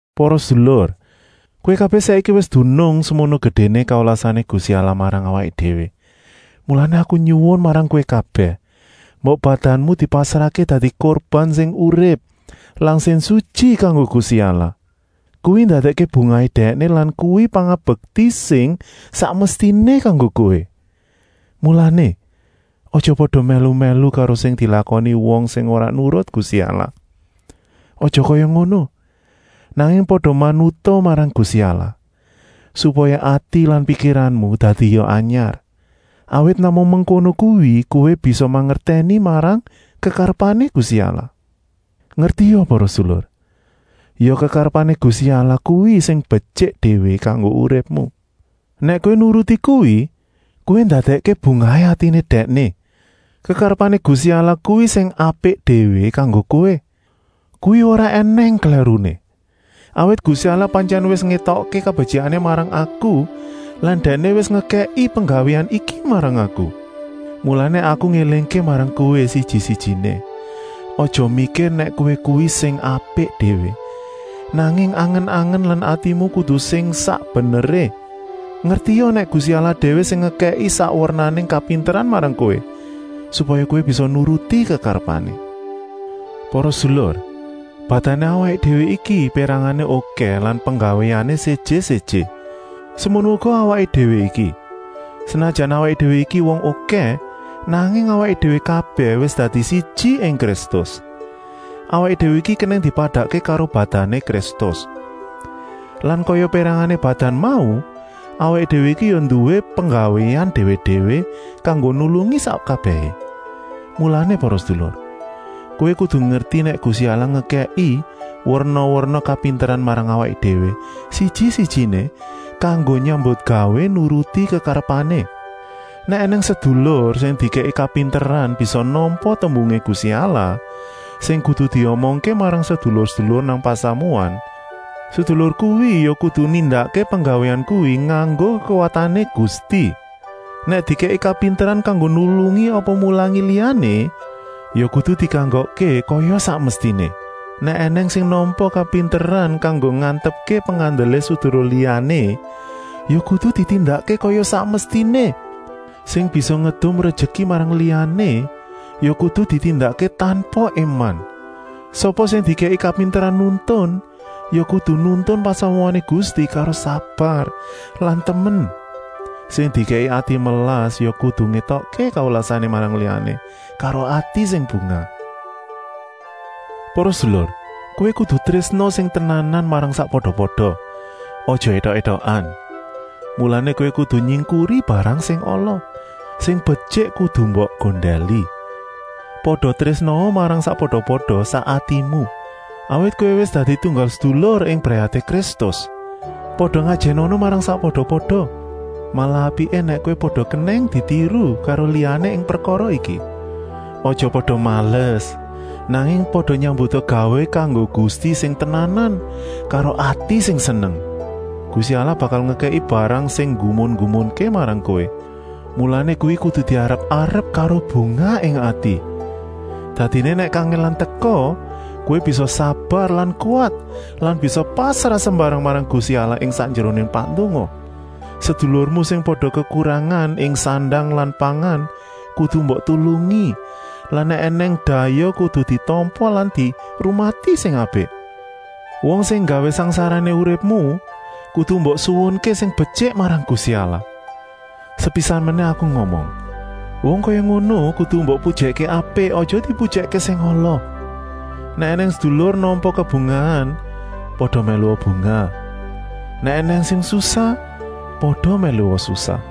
Para sedulur, kowé kabèh saiki wis dunung semono gedéné kawelasané Gusti Allah marang awaké déwé, mulané aku nyuwun marang kowé kabèh, mbok badanmu dipasrahké dadi kurban sing urip lan sing sutyi kanggo Gusti Allah. Kuwi ndadèkké bungahé Dèkné lan kuwi pangabekti sing sak mestiné kanggo kowé. Mulané, aja pada mèlu-mèlu karo sing dilakoni wong sing ora nurut Gusti Allah. Aja kaya ngono, nanging pada manuta marang Gusti Allah, supaya ati lan pikiranmu dadia anyar. Awit namung mengkono kuwi kowé bisa mangertèni marang kekarepané Gusti Allah. Ngertia para sedulur, ya kekarepané Gusti Allah kuwi sing betyik déwé kanggo uripmu. Nèk kowé nuruti kuwi, kowé ndadèkké bungahé atiné Dèkné. Kekarepané Gusti Allah kuwi sing apik déwé kanggo kowé, kuwi ora ènèng klèruné. Awit Gusti Allah pantyèn wis ngétokké kabetyikané marang aku lan Dèkné wis ngekèki penggawéan iki marang aku. Mulané aku ngélingké marang kowé siji-sijiné: aja mikir nèk kowé kuwi sing apik déwé, nanging angen-angen lan atimu kudu sing sak beneré. Ngertia nèk Gusti Allah déwé sing ngekèki sak wernané kapinteran marang kowé, supaya kowé bisa nuruti kekarepané. Para sedulur, badané awaké déwé iki pérangané okèh lan penggawéané séjé-séjé. Semono uga awaké déwé iki, senajan awaké déwé iki wong okèh, nanging awaké déwé kabèh wis dadi siji ing Kristus. Awaké déwé iki kenèng dipadakké karo badané Kristus. Lan kaya pérangané badan mau, awaké déwé iki ya nduwé penggawéan déwé-déwé, kanggo nulungi sak kabèhé. Mulané para sedulur, kowé kudu ngerti nèk Gusti Allah ngekèki werna-werna kapinteran marang awaké déwé siji-sijiné, kanggo nyambutgawé nuruti kekarepané. Nèk ènèng sedulur sing dikèki kapinteran bisa nampa tembungé Gusti Allah sing kudu diomongké marang sedulur-sedulur nang pasamuan, sedulur kuwi ya kudu nindakké penggawéan kuwi nganggo kekuwatané Gusti. Nèk dikèki kapinteran kanggo nulungi apa mulangi liyané, ya kudu dikanggokké kaya sak mestiné. Nèk ènèng sing nampa kapinteran kanggo ngantepké pengandelé sedulur liyané, ya kudu ditindakké kaya sak mestiné. Sing bisa ngedum rejeki marang liyané ya kudu ditindakké tanpa éman. Sapa sing dikèki kapinteran nuntun, ya kudu nuntun pasamuané Gusti karo sabar lan temen. Sing dikèki ati melas ya kudu ngétokké kawelasané marang liyané karo ati sing bungah. Para sedulur, kowé kudu trésna sing tenanan marang sakpada-pada, aja étok-étokan. Mulané, kowé kudu nyingkuri barang sing ala, sing betyik kudu mbok gondèli. Pada trésnaa marang sakpada-pada sak atimu, awit kowé wis dadi tunggal sedulur ing brayaté Kristus. Pada ngajènana marang sakpada-pada, malah apiké nèk kowé pada kenèng ditiru karo liyané ing prekara iki. Aja pada males, nanging pada nyambuta gawé kanggo Gusti sing tenanan karo ati sing seneng. Gusti Allah bakal ngekèki barang sing nggumun-nggumunké marang kowé, mulané kuwi kudu diarep-arep karo bungah ing ati. Dadiné nèk kangèlan teka, kowé bisa sabar lan kuwat lan bisa pasrah sembarang marang Gusti Allah ing sakjeroné pandonga. Sedulurmu sing pada kekurangan ing sandang lan pangan kudu mbok tulungi lan nèk ènèng dayoh kudu ditampa lan dirumati sing apik. Wong sing nggawé sangsarané uripmu kudu mbok suwunké sing betyik marang Gusti Allah. Sepisan menèh aku ngomong: wong kaya ngono kudu mbok pujèkké apik, aja dipujèkké sing ala. Nèk ènèng sedulur nampa kabungahan, pada mèlua bungah, nèk ènèng sing susah, pada mèlua susah.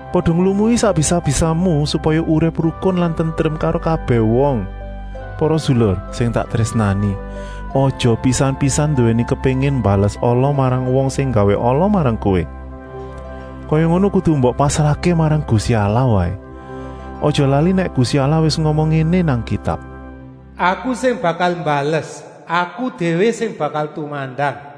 Pada nglumui sak bisa-bisamu, supaya urip rukun lan tentrem karo kabèh wong. Para sedulur sing tak trésnani, aja pisan-pisan nduwèni kepéngin mbales ala marang wong sing nggawé ala marang kowé. Kaya ngono kudu mbok pasrahké marang Gusti Allah waé. Aja lali nèk Gusti Allah wis ngomong ngéné nang Kitab: “Aku sing bakal mbales, Aku déwé sing bakal tumandang.”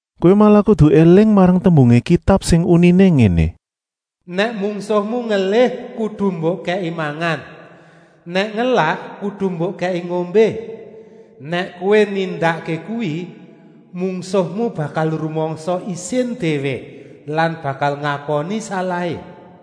Kowé malah kudu éling marang tembungé Kitab sing uniné ngéné: “Nèk mungsuhmu ngelih kudu mbok kèki mangan, nèk ngelak kudu mbok kèki ngombé. Nèk kowé nindakké kuwi, mungsuhmu bakal rumangsa isin déwé lan bakal ngakoni salahé.”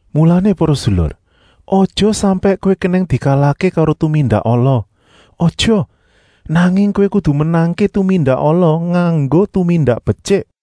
Mulané para sedulur, aja sampèk kowé kenèng dikalahké karo tumindak ala, aja, nanging kowé kudu menangké tumindak ala nganggo tumindak betyik.